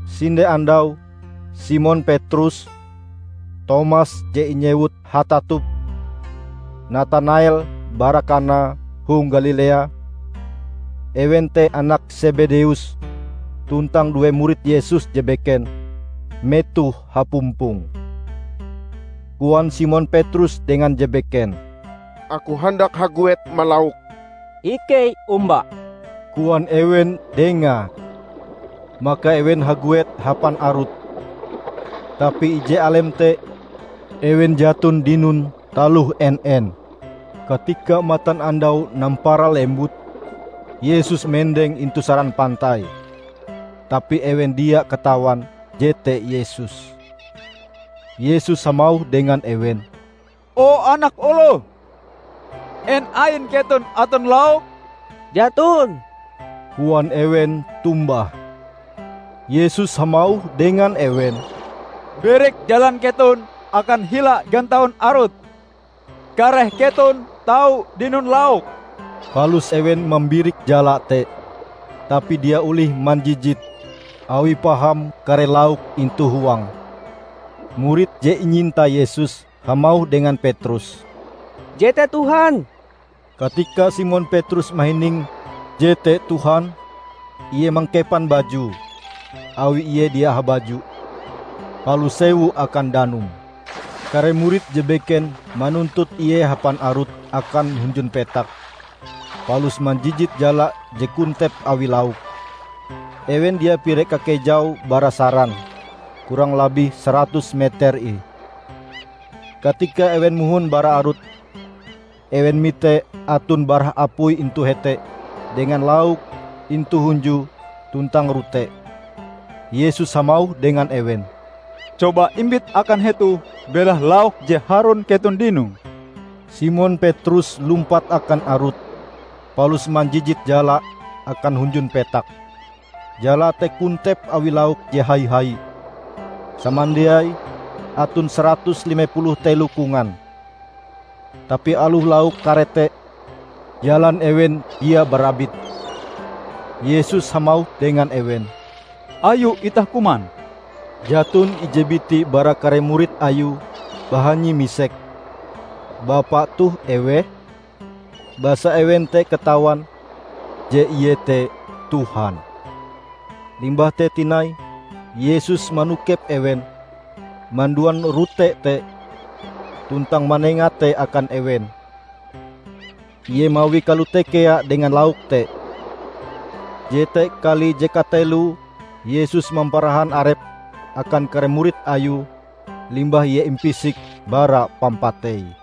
Sinde andau Simon Petrus, Tomas je inyewut "Hatatup", Natanael bara Kana hong Galilea, ewen te anak Sebedeus tuntang due murid Yesus je beken, metohe hapumpong. Koan Simon Petrus dengan je beken, "Aku handak haguet malauk." "Ikei omba," koan ewen dengae. Maka ewen haguet hapan arut. Tapi ije alem te ewen jaton dinon taloh en-en. Katika matanandau nampara lembut, Yesus mendeng intu saran pantai, tapi ewen dia katawan jete Yesus. Yesus hamauh dengan ewen, "O anak oloh, en ain keton aton lauk?" "Jaton," koan ewen tombah. Yesus hamauh dengan ewen, "Birik jalan keton akan hila gantaun arut, kareh keton tau dinon lauk." Palus ewen mambirik jala te, tapi dia olih manjijite awi paham kare lauk intu huange. Murid je inyinta Yesus hamauh dengan Petrus, "Jete Tuhan!" Katika Simon Petrus mahining jete Tuhan, ie mangkepan bajue (awi ie dia habaju) palus sewu akan danum. Kare murid je beken manuntut ie hapan arut akan hunjun petak, palus manjijit jala je kontep awi lauk. Ewen dia pire kakejaue bara saran, kurang labih saratus meter ih. Katika ewen mohon bara arut, ewen mite aton barah apui intu hete dengan lauk intu hunjue tuntang rote. Yesus hamauh dengan ewen, "Coba imbit akan hetoh belahe lauk je harun keton dinoe." Simon Petrus lumpat akan arut, palus manjijit jalae akan hunjun petak. Jalae te kontep awi lauk je hai-hai, samandiaie aton saratus lime puluh telo kongan. Tapi aloh lauk kare te, jalan ewen dia barabit. Yesus hamauh dengan ewen, "Ayo itah kuman." Jaton ije biti bara kare murid Ayue bahanyi misek, "Bapa toh eweh?" Basa ewen te katawan je Ie te Tuhan. Limbah te tinai Yesus manokep ewen, manduan rote te, tuntang manenga te akan ewen. Ie mawie kalote kea dengan lauk te. Jete kali je kateloe Yesus mamparahan arepe akan kare murid Ayue limbah Ie impisik bara pampatei.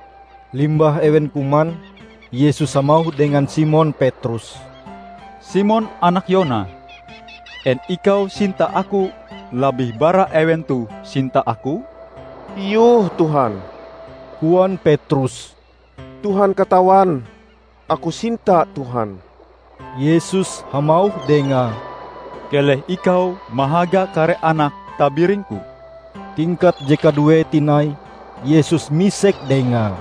Limbah ewen kuman, Yesus hamauh dengan Simon Petrus, "Simon anak Yona, en ikau sinta Aku labih bara ewen toh sinta Aku?" "Iyoh, Tuhan," koan Petrus, "Tuhan katawan Aku sinta Tuhan." Yesus hamauh dengae, "Keleh ikau mahaga kare anak tabiring-Ku." Tingkat je kaduee tinai Yesus misek dengae,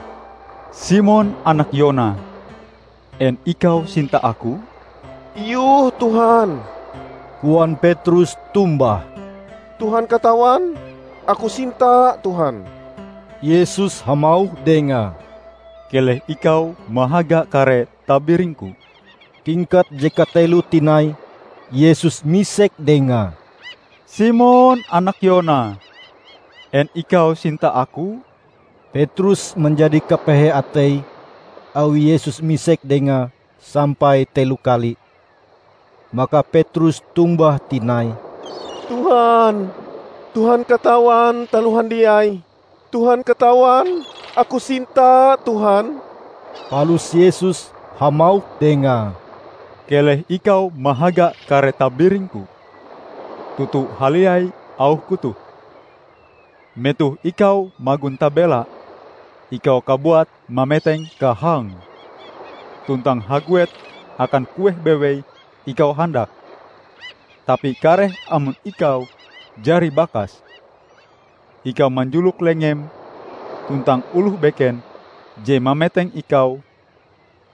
"Simon anak Yona, en ikau sinta Aku?" "Iyoh, Tuhan," koan Petrus tombah, "Tuhan katawan Aku sinta Tuhan." Yesus hamauh dengae, "Keleh ikau mahaga kare tabiring-Ku." Tingkat je kateloe tinai Yesus misek dengae, "Simon anak Yona, en ikau sinta Aku?" Petrus manjadi kapehe ateie awi Yesus misek dengae sampai telo kali. Maka Petrus tombah tinai, "Tuhan, Tuhan katawan taloh handiai. Tuhan katawan aku sinta Tuhan!" Palus Yesus hamauh dengae, "Keleh ikau mahaga kare tabiring-Ku. Toto haliai auh-Ku toh: Metoh ikau magon tabela, ikau kabuat mameteng kahangm, tuntang haguet akan kueh bewei ikau handak. Tapi kareh amon ikau jari bakas, ikau manjulok lengem, tuntang oloh beken je mameteng ikau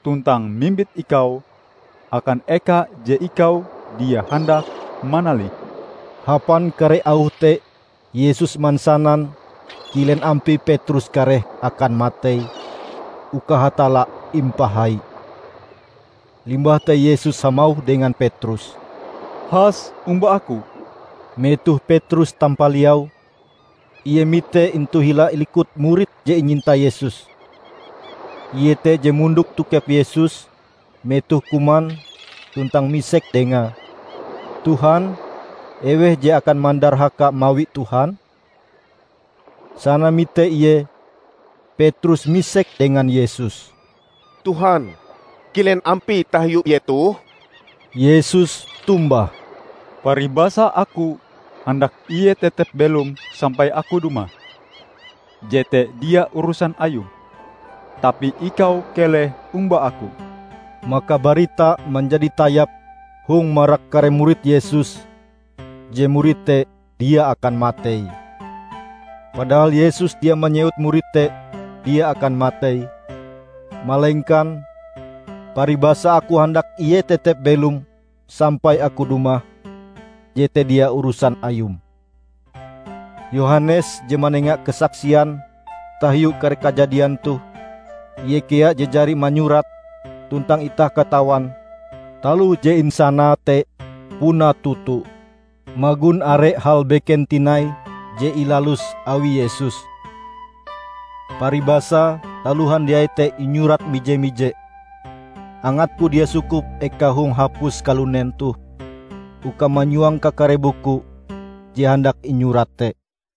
tuntang mimbit ikau akan eka je ikau dia handak manalihe." (Hapan kare auh te Yesus mansanan kilen ampie Petrus kareh akan matei uka Hatalla impahai.) Limbah te Yesus hamauh dengan Petrus, "Has omba Aku!" Metoh Petrus tampaliau, ie mite intu hila likute murid je inyinta Yesus. (Ie te je mondok tokep Yesus metoh kuman tuntang misek dengae, "Tuhan, eweh je akan mandarhaka mawi Tuhan?") Sana mite ie, Petrus misek dengan Yesus, "Tuhan, kilen ampie tahiu ie toh?" Yesus tombah, "Paribasa Aku handak ie tetep belom sampai Aku dumah, jete dia urusan ayum. Tapi ikau keleh omba Aku!" Maka baritae manjadi tayap hong marak kare murid Yesus je murid te dia akan matei. Padahal Yesus dia manyewut murid te dia akan matei, malengkan: "paribasa Aku handak ie tetep belom sampai Aku dumah, jete dia urusan ayum." Yohanes je manenga kasaksian tahiu kare kajadian toh. Ie kea je jari manyurate, tuntang itah katawan taloh je insanae te puna toto. Magon are hal beken tinai je ilalus awi Yesus. Paribasae taloh handiai te inyurat mije-mije, angatku dia sukup eka hong hapus kalunen toh uka manyuang kakare buku je handak inyurat te.